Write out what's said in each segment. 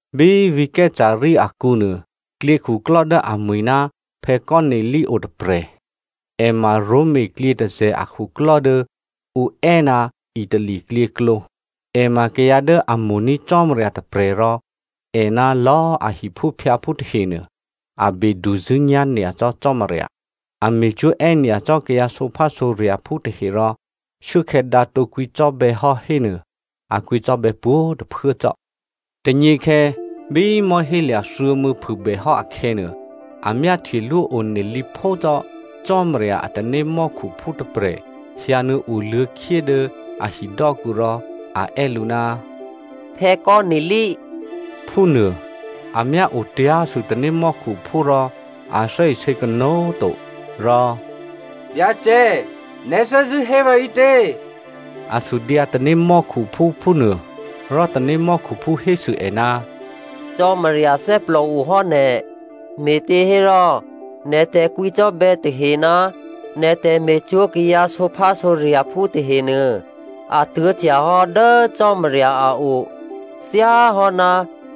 Bí vǐ̤ Caesarea akǔ nuô klyěkhuklò́ dố amwi̤ ná Cornelio otôprè̤, è ma Roma klyětôzè̤ akhuklò́ dố ǔ è́ ná Itali klyěklǒ. È ma kayǎ dố a mo̤ní̤ Cò́marya tôprè̤ rò è ná lò̌꤮ a hiphúphyǎphú tahenuô a beduzṳ̂́nyá̤ nyacò́ Cò́marya. A me̤cwó̤ è́nyacò́ kayǎ sǒphásǒrya̤phú tahe rò shuốkhè̌ dǎ tǒ kwǐcò́bè̌ hò́ hénuô, a kwǐcò́bè̌ pwǒ̤꤮ tôphuố cò́. Tônyěkhè̌ bí mò̤́hélya̤ thuô̌mû̌ phûbèhò́ akhè̌nuô, a myáhtyelwó one lǐphó cò́ Cò́marya a tanémò́khuphú tôprè̤ hyǎnuô̌ oluô̌khyé dố a hidò́kǔ rò a è́ lǔ, “Cornelio!” phúnuô. A myá otyá̤sû tanémò́khuphú rò a thè́isě kanó̤꤮ to rò “Byacè, nè̤ thè́zṳ̂́ hé vǎ ǐtě?” A sudyǎ tanémò́khuphú phúnuô, Rò tanémò́khuphú hésû è, “Cò́marya thè́plòohò́ nè̤, me̤těhérò nè̤ tè̤kwǐcò́bè̌ tahe ná nè̤ tè̤me̤cwó̤ kayǎ sǒphásǒrya̤phú tahenuô, a tuố̤htyahò́ dố Cò́marya a o thyáhò́ná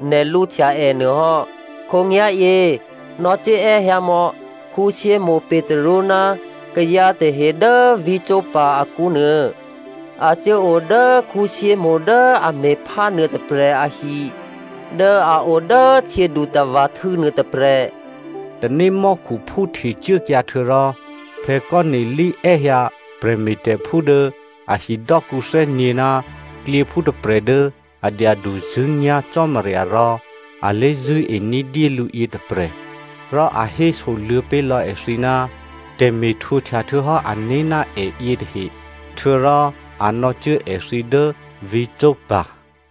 nè̤ lǔhtya è nuôhò́. Khǒnyá̤yě nò̌cuố è́hyǎmò̌ Simonè Petru ná kayǎ tahe dố vǐ̤ Joppa akǔ nuô. A cuốo dố Simonè dố a me̤phá nuôtôprè̤ ahi dố a o dố htyědutava̤htû̌ nuôtôprè̤.” Tanémò́khuphú htecuốkyǎ htuô̌rò, Cornelio è́hyǎ prè̤me̤tè̤phú dố a hidò́kǔ thè́nyě̤ ná klyěphú tôprè̤ dố a dyaduzṳ̂́nyá̤ Cò́marya rò a lé̤zṳ̂́e ní̤dyé lǔ yětôprè̤, rò a hésoluô̌ pé̤lò̌ èthǐ ná tè̤me̤htwǒhtya htuô̌hò́ ané̤ ná è yětahe, htuô̌rò a nò̌cuố èthǐ dố vǐ̤ Joppa.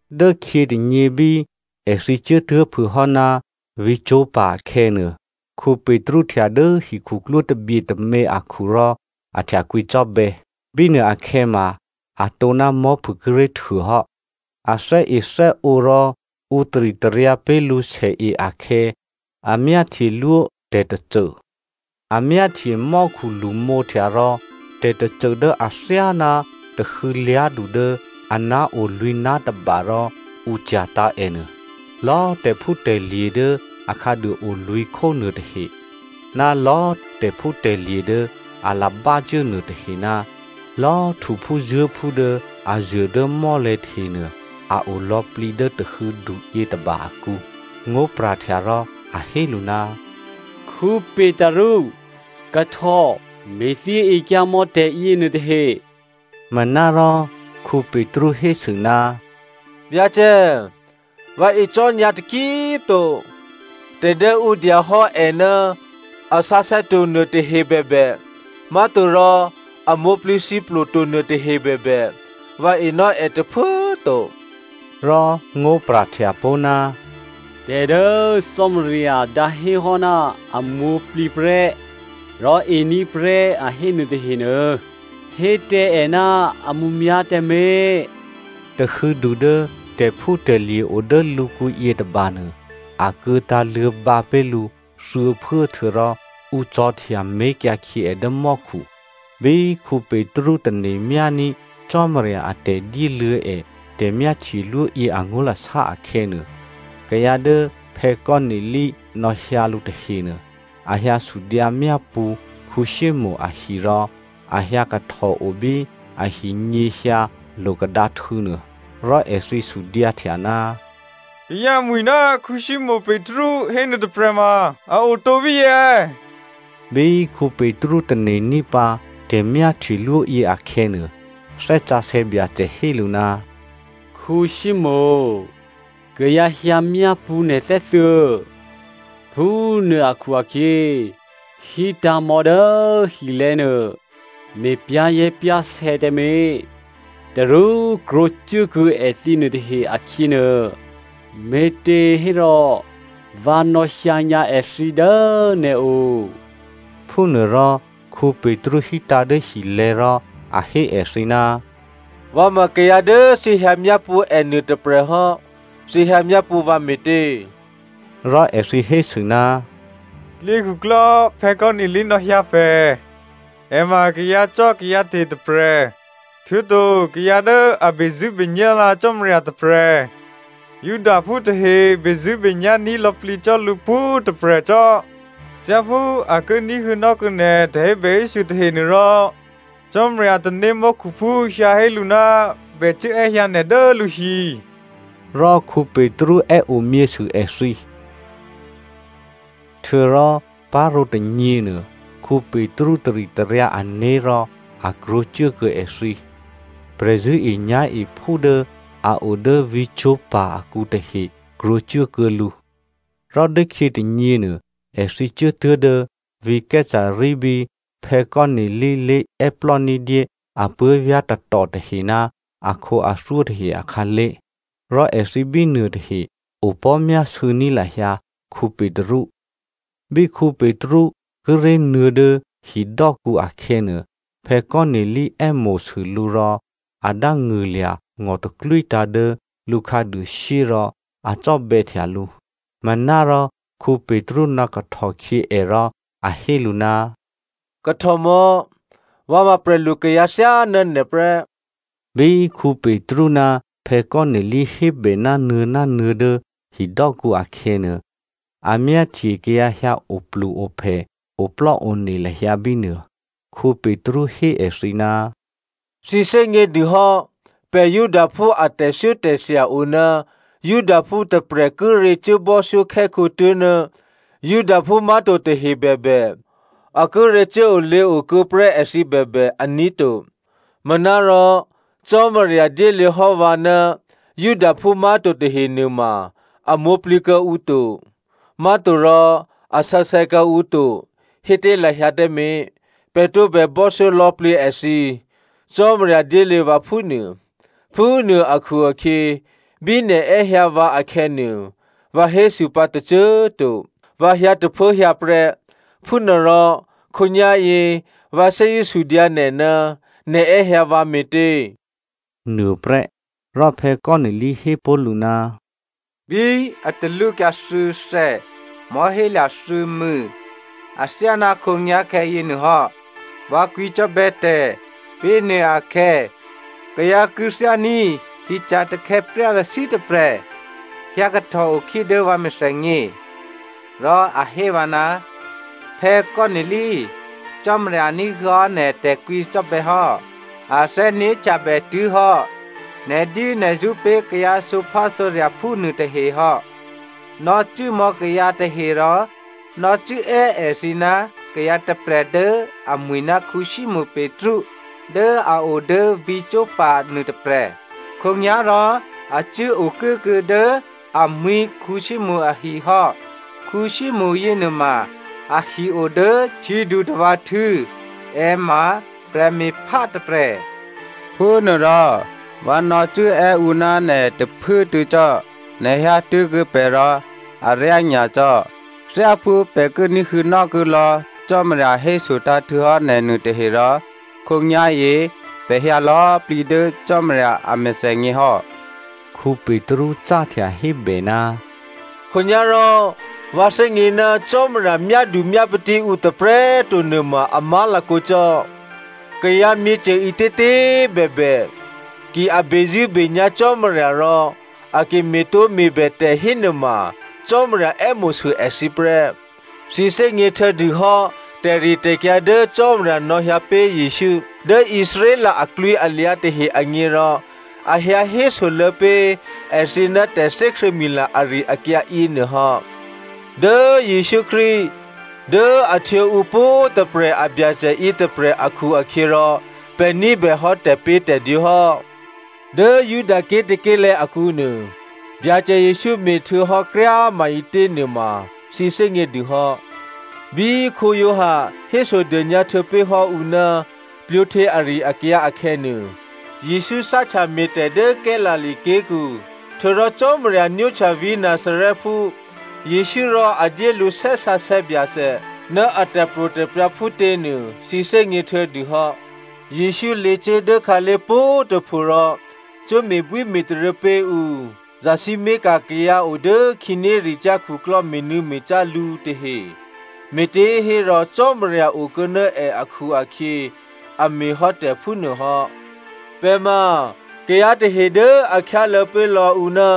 Dốkhyětônyě bí èthǐ cuốtuố̤phûhò́ ná vǐ̤ Joppa akhè̌nuô, Petru htya dố hikhuklwó tabye tômě akhu rò a htya kwǐcò́bè̌. Bínuô akhè̌ ma atǒ ná mò̤́phû kíré̤ htuôhò́. A thè́ethè́ǒ rò ǔ taritaryǎ pé̤ lǔ sèe akhè̌ a myáhtyelwó tè̤tôcô. A myáhtye mò́khu lṳmǒhtya rò tè̤tôcô dố athyáná tahû̌ lyá̤du dố aná̤ o lwǐ̤ná̤ tôba rò ǔ cya̤tǎ̤ ènuô. Lò̌꤮ tè̤phútè̤lye̤ dố a khǎduôo lwǐ̤khó nuôtahe ná lò̌꤮ tè̤phútè̤lye̤ dố a labácuố nuôtahe ná lò̌꤮ htuphúzuố̤phú dố a zuô̤ dố mò́lè̤̌ tahenuô a o lò̌plǐ dố tahû̌du yětôba akǔ. Ngó̤pra̤htya rò a hé lǔ, “Petru꤮ kahtò me̤thyěekyǎmò̌ tè̤yěnuôtahe.” Manárò Petru hésû, “Byacè꤮ vǎ e cò́nyǎ taki꤮ to, tè̤ dố ǔ dyahò́ è ná a sǎsè̌to nuôtahe bèbè, má̤torò a mwǒ̤plǐthǐplo to nuôtahe bèbè, vǎ enò́ è tôphuố꤮ to.” Rò ngó̤pra̤htya pó̤, “Tè̤ dố Cò́marya dǎhéhò́ ná a mwǒ̤plǐ prè́, rò ení̤ prè́ a hé nuôtahenuô, hé tǎ è ná a mǔmyá̤ tǎmé̤.” Tahû̌du dố tè̤phútè̤lye̤ o dố lǔkǔ yětôbanuô, akuô̌ tǎ̤luô̌ bǎ pé̤ lǔ thuô̌phuố htuô̌rò ǔ cò̤̌htya mé̤kyǎ khyě è dố mò́khu. Bí Petru tane̤myání̤ Cò́marya a tè̤dyéluô̌ è tè̤myáhtyelwó yě angó̤lasá akhè̌nuô, kayǎ dố Cornelio nò̌hyǎ lǔ tahenuô, a hyǎ sudyǎ myápṳ̌ Simonè ahi rò a hyǎkahtòo bí ahinyěhyǎ lo̤kadǎhtû̌nuô. Rò èthǐ sudyǎhtya, “Kayǎ mwi̤ ná Simonè Petru hénuô tôprè̤ ma a otǒ bíyě è̌?” Bí Petru tane̤ní̤pǎ tè̤myáhtyelwó yě akhè̌nuô, Thè́ Sǎsè̌ Byacè hé lǔ, “Simonè! Kayǎ hyǎmyápṳ̌ nè̤ thè́thuô̌. Phúnuô akhu-akhyě hítǎ̤mò̌ dố hilè̤̌ nuô, me̤ pyá̤zè̤́pyá̤sè̌ tǎmé̤, tarú krwǒcuốkuô̌ èthǐ nuôtahe akhyěnuô, me̤těhérò vǎ nò̌hyǎnyǎ èthǐ dố nè̤o.” Phúnuôrò Petru hítǎ̤ dố hilè̤̌ rò a hé èthǐ, “Vǎ ma kayǎ dố thǐ hyǎ myápṳ̌ è nuôtôprè̤ hò́. Thǐ hyǎmyápṳ̌ vǎ me̤tě?” Rò èthǐ hésû, “Klyěkhuklò́ Cornelio nò̌hyǎ pè̤. È ma kayǎcò́kayǎte̤ tôprè̤, htuô̌to kayǎ dố a bezṳ̂́benyá̤lǎ Cò́marya tôprè̤. Judaphú tahe bezṳ̂́nyá̤ní̤ lò̌plǐ cò́ lǔ pwǒ̤꤮ tôprè̤ cò́. Thyáphú a ki ní̤huô̌nò́ kuô̌ nè̤ tè̤hébèhésû̌ tahenuô rò Cò́marya a tanémò́khuphú hyǎ hé lǔ ná bè cuố è́hyǎ nè̤ dố lǔhi.” Rò Petru è́ omyěsû èthǐ. Htuô̌rò parǒ tônyěnuô, Petru taritaryǎ ané̤ rò a krwǒcuốkuô̌ èthǐ. Prè̤zṳ̂́enyá̤ephú dố a o dố vǐ̤ Joppa akǔ tahe krwǒcuốkuô̌ lǔ. Rò dốkhyě tônyěnuô èthǐ cuốtuố̤ dố vǐ̤ Caesarea bí Cornelio lé̤è́plò́ ní̤dyé apuố̤vyá̤ tatò tahe ná akhǒathyó tahe akhǎlé̤, rò èthǐ bínuôtahe opò̤́myásû̌ ní̤ lahyǎ Petru. Bí Petru kíré̤ nuô̌ dố hidò́kǔ akhè̌nuô, Cornelio è́mo̤sû lǔ rò a dángṳ̂lya̤ ngò̤taklwítǎ̤ dố lǔ khǎduôshyé rò a cò́bè̌htya lǔ. Manárò Petru nò̌kahtòkhyě è rò a hé lǔ, “Kahtòmò̌꤮ vǎ ma prè̤lu kayǎ thyáná nè̤ prè́.” Bí Petru ná Cornelio hébè nánuô̌ dố hidò́kǔ akhè̌nuô, a myáhtye kayǎ hyǎoplu-ophè, oplò́one lahyǎ bínuô. Petru hé èthǐ, “Thǐ thè́gně dûhò́, pè̤ Judaphú a tè̤thyótè̤thya oná Judaphú tôprè̤ kíré̤ cuốbò́thyókhè́khǒ tố̤ná Judaphú má̤to tahe bèbè, a kíré̤ cuốolěo kuô̌ prè́ èthǐ bèbè, aní̤ to. Manárò Cò́marya dyéluô̌hò́ vǎ ná Judaphú má̤to tahe nuôma a mwǒ̤plǐ kuô̌ǔ to, má̤torò a sǎsè̌ kuô̌ǔ to hé tǎ lahyǎ tǎmé̤, pè̤ tǒbè bò́thyó lò̌plǐ èthǐ, Cò́marya dyéluô̌ vǎ phúnuô. Phúnuô akhu-akhyě bí nè̤ è́hyǎ vǎ akhè̌nuô, vǎ hésû pǎ tôcô꤮ to, vǎ hyǎ tôphuốhyǎ prè́. Phúnuôrò khǒnyá̤yě vǎ thè́zṳ̂́ sudyǎ nè̤, nè̤ è́hyǎ vǎ me̤tě?” nuôprè́. Rò Cornelio hé pé̤ lǔ, “Bí a talwókyǎ thuô̌thè̌ mò̤́hélya̤ thuô̌mû̌ athyáná khǒnyá̤khè̌ yěnuôhò́, vǎ kwǐcò́bè̌ tè̤. Bínuôakhè̌, kayǎ kû̌thyání̤ hyeca̤ takhè̌plyarashyǐ tôprè̤ hyǎkahtòo khyé dố vǎ mèthènyě. Rò a hé vǎ, ‘Cornelio꤮ Cò́marya ní̤huô̌hò́ nè̤ tè̤kwǐcò́bè̌ hò́. A thè́né̤htyabè tuố̤ hò́ nè̤dyénè̤zṳ̌ pé̤ kayǎ sǒphásǒrya̤phú nuôtahe hò́. Nò̌cuốmò̌ kayǎ tahe rò nò̌cuốè́ èthǐ ná kayǎ tôprè̤ dố amwi̤ ná Simonè Petru dố a o dố vǐ̤ Joppa nuôtôprè̤. Khǒnyá̤rò a cuố okuốkuô̌ dố amwǐ̤ Simonè ahi hò́. Simonè yěnuôma ahi o dố htyědutava̤htû̌, è ma prè̤me̤phá tôprè̤.’ Phúnuôrò vǎ nò̌cuốè́ ǔ ná nè̤ tôphuốtuô̌ cò́, nè̤ hyǎtuố̤kuô̌ pè̤ rò aryá nyacò́. Thyáphú pè̤ ki ní̤huô̌nò́ kuô̌lò̌ Cò́marya hésotǎ̤ htuô̌hò́ nè̤ nuôtahe rò khǒnyá̤yě pè̤ hyǎ lò̌plǐ dố Cò́marya a mèthènyěhò́.” Petru cáhtya hébè, “Khǒnyá̤rò vǎ thè́gně ná Cò́marya myádumyápatí ǔ tôprè̤꤮ to nuôma a má̤lakǒ cò́. Kayǎ myěcô ǐtětě꤮ bèbè, ki a bezṳ̂́benyá̤ Cò́marya rò a ki me̤tǒme̤bè tè̤ hénuôma Cò́marya è́mo̤sû èthǐ prè́. Thǐ thè́gně htuô̌dû hò́ tè̤ritè̤kyǎ dố Cò́marya nò̌hyǎ pé̤ Jesǔ dố Israel aklwǐalyǎ tahe agně rò a hyǎ hésoluô̌ pé̤ èthǐ ná tè̤thè́krṳ̂̌mila ari-akyǎ yěnuô hò́. Dố Jesǔ Krístu dố a htwǒ ǔ pwǒ̤꤮ tôprè̤ a Byacè yětôprè̤ akhu-akhyěrò pè̤ ní̤bèhò́ tè̤pě̤tè̤dwǒ hò́. Dố Judaké̤ tôké̤lè̤̌ akǔnuô, Byacè Jesǔ me̤htuô̌hò́ kryá꤮ maǐtě nuôma thǐ thè́gně dû hò́. Bí Giovanni hésodônyǎ htuô̌pé̤hò́ ǔ ná plwǒhtyě ari-akyǎ akhè̌nuô, Jesǔ cáhtya me̤tè̤ dố Galilea ké̤kǔ. Htuô̌rò Cò́marya nwóhtya vǐ̤ Nazarèphú Jesǔ rò a dyé lǔ Thè́ Sǎsè̌ Byacè ná a tè̤pro̤tè̤prya̤ phútě nuô, thǐ thè́gně htuô̌dûhò́. Jesǔ lěcuố dố khǎlé̤ pwǒ̤꤮ tôpho rò cuố me̤bwíme̤taryě pé̤ ǔ, zasǐmé̤ka̤ kayǎ o dố khǐnéricyá̤ khuklò́ me̤nû̌me̤cá lǔ tahe, me̤těhérò Cò́marya okuô̌ ná è akhu-akhyě a me̤hò́ tè̤ phúnuô hò́. “Pè̤ ma kayǎ tahe dố a khyáluô̌ pé̤ lò̌ ǔ ná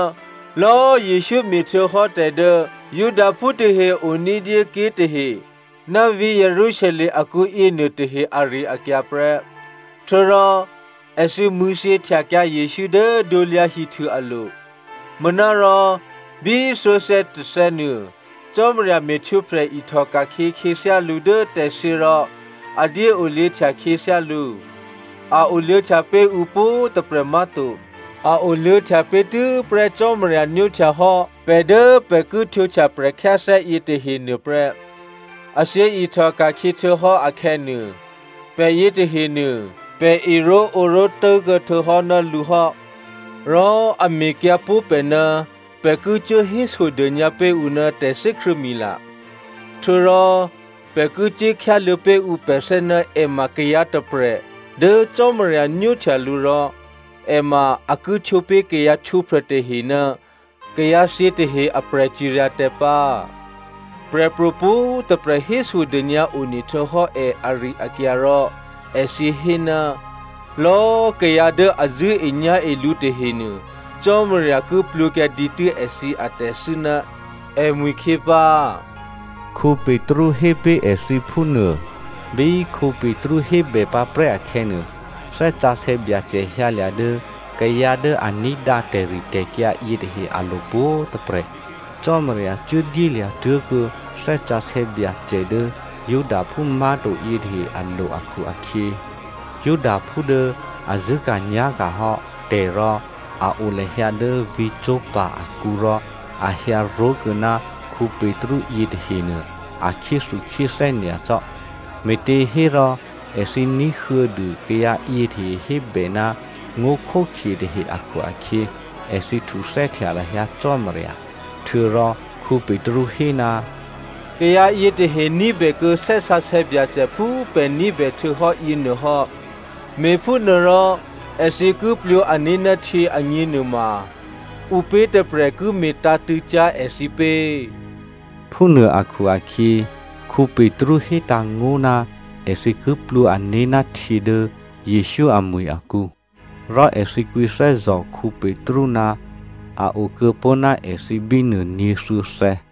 lò̌꤮ Jesǔ me̤htuô̌hò́ tè̤ dố Judaphú tahe o ní̤dyé ké̤ tahe, ná vǐ̤ Jerusalem akǔ yěnuôtahe ari-akyǎ prè́. Htuô̌rò èthǐ mṳ̂̌thyěhtyakyǎ Jesǔ dố krusu alo̤. Manárò bí thuô̌thè̌ tôthè̌nuô, Cò́marya me̤htwǒprè̤ ihtòka̤khyě khyěthyá lǔ dố tè̤thyě rò a dyéoluô̌htya khyěthyá lǔ. A oluô̌htya pé̤ ǔ pwǒ̤꤮ tôprè̤ má̤to. A oluô̌htya pé̤ tû́prè́ Cò́marya nwóhtyahò́ pè̤ dố pè̤ ki htwǒhtya prè̤khyáthè́ yětahe nuôprè́. A thyěihtò ka̤khyě htuô̌hò́ akhè̌nuô, pè̤ yětahenuô, pè̤ eró̤ǒró̤ tố̤kuô̌ htuô̌hò́ ná lǔ hò́. Rò a mekyǎ pó̤ pè̤ ná pè̤ ki cuố hésodônyǎ pé̤ ǔ ná tè̤thè́krṳ̂̌mila, htuô̌rò pè̤ ki cuốkhyáluô̌ pé̤ ǔ pè̤thè́ ná è ma kayǎ tôprè̤ dố Cò́marya nwóhtya lǔ rò è ma a ki htwǒ pé̤ kayǎ htwǒprè̤ tahe ná kayǎthyě tahe a prè̤ciryatè̤ pǎ. Prè̤pro̤ pwǒ̤꤮ tôprè̤ hésodônyǎ one htuô̌hò́ è ari-akyǎ rò èthǐ hé, ‘Lò̌꤮ kayǎ dố a zṳ̂́enyá̤e lǔ tahenuô Cò́marya ki plwǒkyǎ dǐtû́ èthǐ atè̤thû́ ná èmwi̤khyě pǎ,’” Petru hé pé̤ èthǐ phúnuô. Bí Petru hébè pǎprè́ akhè̌nuô, Thè́ Sǎsè̌ Byacè hyǎlya̤ dố kayǎ dố a ní̤dǎ tè̤ritè̤kyǎ yětahe alo̤ pwǒ̤꤮ tôprè̤. Cò́marya cuố dyélya̤ tuố̤kuô̌ Thè́ Sǎsè̌ Byacè dố Judaphú má̤to yětahe alo̤ akhu-akhyě, Judaphú dố a zṳ̂́ka̤nyá̤ka̤ hò́ tè̤ rò a o lahyǎ dố vǐ̤ Joppa akǔ rò a hyǎ ró̤kuô̌ ná Petru yětahenuô a khyéthukhyéthè́ nyacò́. Me̤těhérò èthǐ ní̤huô̌ dû kayǎ yětahe hébè ná ngó̤khókhye tahe akhu-akhyě, èthǐ htuthè́htya lahyǎ Cò́marya. Htuô̌rò Petru hé, “Kayǎ yětahe ní̤bèkuô̌ Thè́ Sǎsè̌ Byacè phú pè̤ ní̤bè htuô̌hò́ yěnuôhò́. Me̤phúnuôrò èthǐ ki plwǒ ané̤ ná htyě agněnuô maǔpě tôprè̤ ki me̤tǎ̤tṳ̂̌cyá̤ èthǐ pě.” Phúnuô akhu-akhyě Petru hétǎ̤ngó̤ ná èthǐ ki plwǒ ané̤ ná htyě dố Jesǔ amwi̤ akǔ. Rò èthǐ kwǐthè́zò̤ Petru ná a okuô̌pó̤ ná èthǐ bínuô nyě̤thuô̌thè̌.